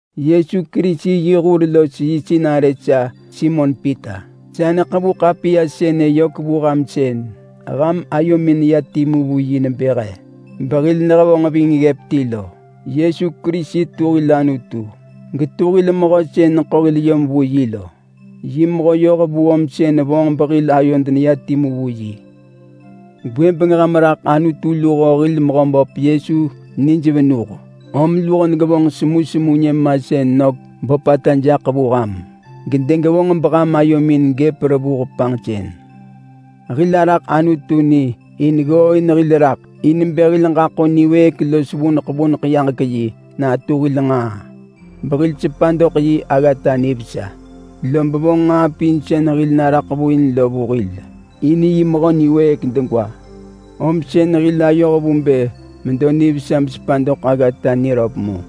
Yesu Kerisi yi hur los yi sinarë sa Simon Pita. Sa neḳevu ḳapiya sënë yök vu ham sën ham ayomin neya timu vu yi nebë he behil nehevonġ ving ggëp ti lo. Yesu Kerisi tu hil Anutu, getu hil mehö sën neḳo hil yom vu yi lo. Yi mehö yohvu om sën vonġ behil ayod neya timu vu yi. Gwëbeng ham raḳ Anutu luho hil Mehöböp Yesu nij venuh, om luho degevonġ semusemu nyëmasën nök böpata jaḳ vu ham, gedegevonġ beham ayomin gëp revuh rot. Hil araḳ Anutu ni in ggooin hil raḳ in bë hil ġaḳo niwëëk los vuneḳ vuneḳ yaġek-yi natu hil nġaa behil sepa doḳ yi aggata nivesa. Lob vonġ nġaa pin sën hil naraḳ vu in lo vu hil in yi mehö niwëëk degwa, om sën hil ayoh vu bë medo nivesa besepa doḳ aggata niröp mu.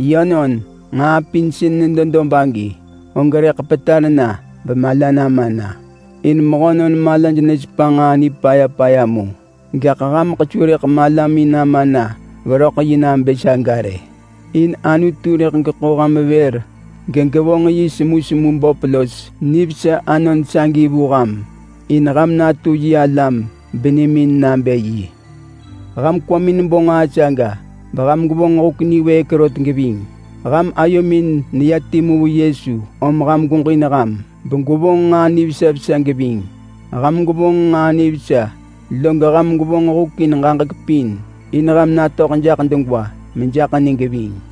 Yönon, nġaa pin sën nedo dob agi og rëḳ petar na bemala nama na, in mehönon malaj nesepa nġaa nipaya paya mu. Gaḳ hameḳ su rëḳ malamin nama na veröḳ yi nabë saga rë. In Anutu rëḳ geḳo ham vër gegevonġ yi semusemu böp los nivesa anon sagi vu ham in ham natu yi alam benimin nabë yi. Ham kwamin bo nġaa saga beham gwevonġ huk niwëëk rot geving. Ham ayomin neya timu vu Yesu om ham gweġin ham begwevonġ nġaa nivesa vesa geving. Ham gwevonġ nġaa nivesa, log ham gwevonġ huk in ġaġek pin in ham natöḳ jaḳ degwa mejaḳ ni geving.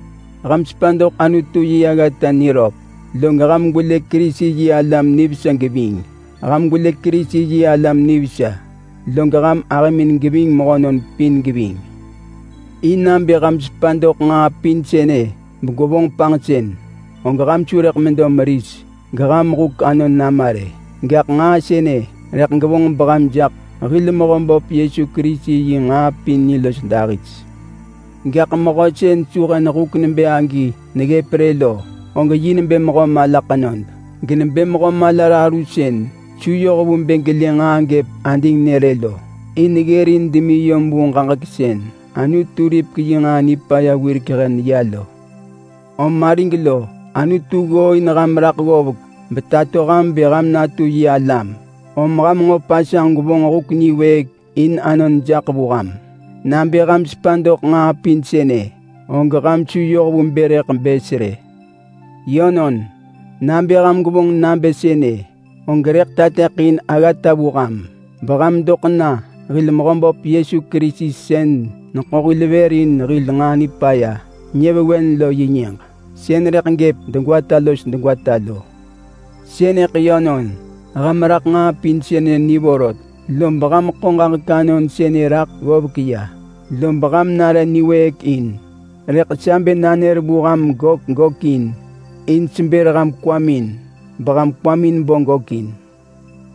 Ham sepa doḳ Anutu yi aggata niröp, log ham gwelë Kerisi-yi-alam nivesa geving. Ham gwelë Kerisi-yi-alam nivesa, log ham ahëmin geving mehönon pin geving. In nabë ham sepa doḳ nġaa pin sënë begwevonġ panġsën, og ham su rëḳ medo meris geham huk anon nama rë. Gaḳ nġaa sënë rëḳ gevonġ beham jaḳ hil Mehöböp Yesu Kerisi yi nġaa pin ni los dahis. Gaḳ mehö sën su hen huk nebë agi neggëp rë lo, og yi nebë mehö mala ḳenod. Genebë mehö mala raru sën su yoh vu bë gelë nġaa gëp adingnë rë lo. In ggërin demi yom vu ġaġek sën Anutu ripek yi nġaa nipaya wirek hen ya lo. Om arig lo, Anutu ggooin ham raḳ ggovek betato ham bë ham natu yi alam, om ham nġo pasanġ gwevonġ huk niwëëk in anon jaḳ vu ham. Nabë ham sepa doḳ nġaa pin sënë, og ham su yoh vu bë rëḳ bës rë. Yönon, nabë ham gwevonġ nabë sënë, og rëḳ tateḳin aggata vu ham, beham doḳ na hil Mehöböp Yesu Kerisi sën neḳo hil vër in hil nġaa nipaya nyëvewen lo yi nyëġ. Sën rëḳ gëp degwata los degwata lo. Sënëḳ yönon, ham raḳ nġaa pin sënë ni vorot. Lob ham ḳo ġaġek anon sënë raḳ ggovek ya, lob ham nare niwëëk in. Rëḳ sa bë nanër vu ham gök gökin, in sebër ham kwamin beham kwamin bo gökin.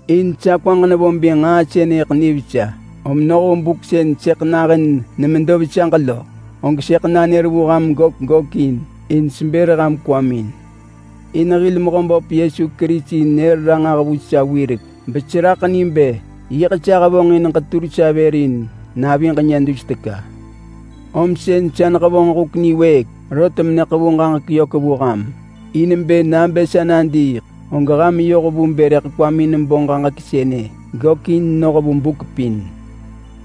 In sa kwaġ nevo bë nġaa sënëḳ nivesa, om noh vu buk sën sëḳ nahën nemedo vesaġ lo, og sëḳ nanër vu ham gök gökin in sebër ham kwamin. In hil Mehöböp Yesu Kerisi nër ranġah vu sa wirek beseraḳ ni bë yiḳ sa hevonġin ġetur sa vër in naviġ nyë dus teka. Om sën sa nehevonġ huk niwëëk rot meneḳevu ġaġek yök vu ham, in bë nabë sa nadiiḳ, og ham yoh vu bë rëḳ kwamin bo ġaġek sënë gökin noh vu buk pin.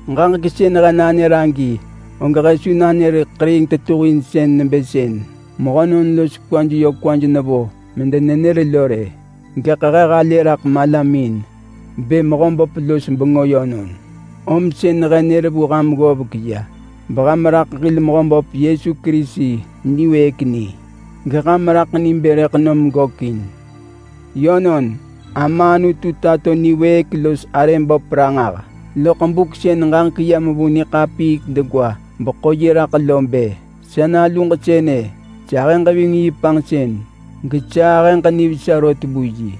Ġaġek sën he nanër agi og he su nanër ḳeriing tetuhinsën nebë sën mehönon los kwaj yö kwaj nevo medenenër lo rë. Gaḳ he halë raḳ malamin bë Mehöböp los bengö yönon. Om sën he nër vu ham ggovek ya beham raḳ hil Mehöböp Yesu Kerisi niwëëk ni, geham raḳ ni bë rëḳ nom gökin. Yönon, Ama Anutu tato niwëëk los arë böp ranġah loḳ buk sën ġaġek yam vu niḳapiik degwa beḳo yi raḳ lo bë, “Sa naluġ sënë, sahëġ ving yi panġsën gesa ahëġ nivesa rot vu yi.”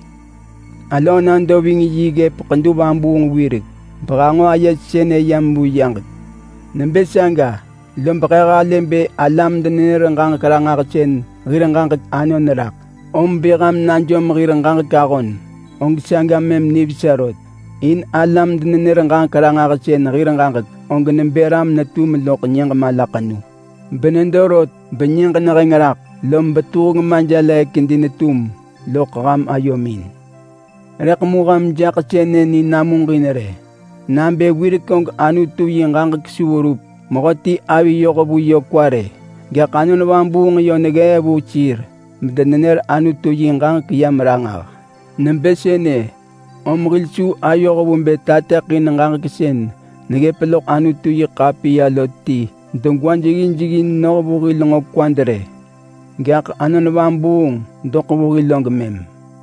Alöö nado ving yi ggëp ḳedu vabuung wirek behanġo aye sënë yam vu yaġek. Nebë saga, lob he halë bë alam-denenër-ġaġek-ranġahsën hir ġaġek anon raḳ. Om bë ham najom hir ġaġek ahon, og saga mëm nivesa rot. In alam-denenër-ġaġek-ranġahsën hir ġaġek og nebë ram sën netum loḳ nyëġ malaḳenu, benedo rot benyëġ neheng raḳ lob Betuheng Majelëë kedi netum loḳ ham ayomin lo. Rëḳ mu ham jaḳ sënë ni namuġin rë nabë wirek og Anutu yi ġaġek su verup mehöti avi yoh vu yö kwa rë. Gaḳ Anon Vabuung yö neggee vu sir bedenenër Anutu yi ġaġek yam ranġah. Nebë sënë om hil su ayoh vu bë tateḳin ġaġek sën neggëp loḳ Anutu-yi-ḳapiya lo ti degwa jeggin jeggin noh vu hil nġo kwad rë, gaḳ Anon Vabuung doḳ vu hil og mëm.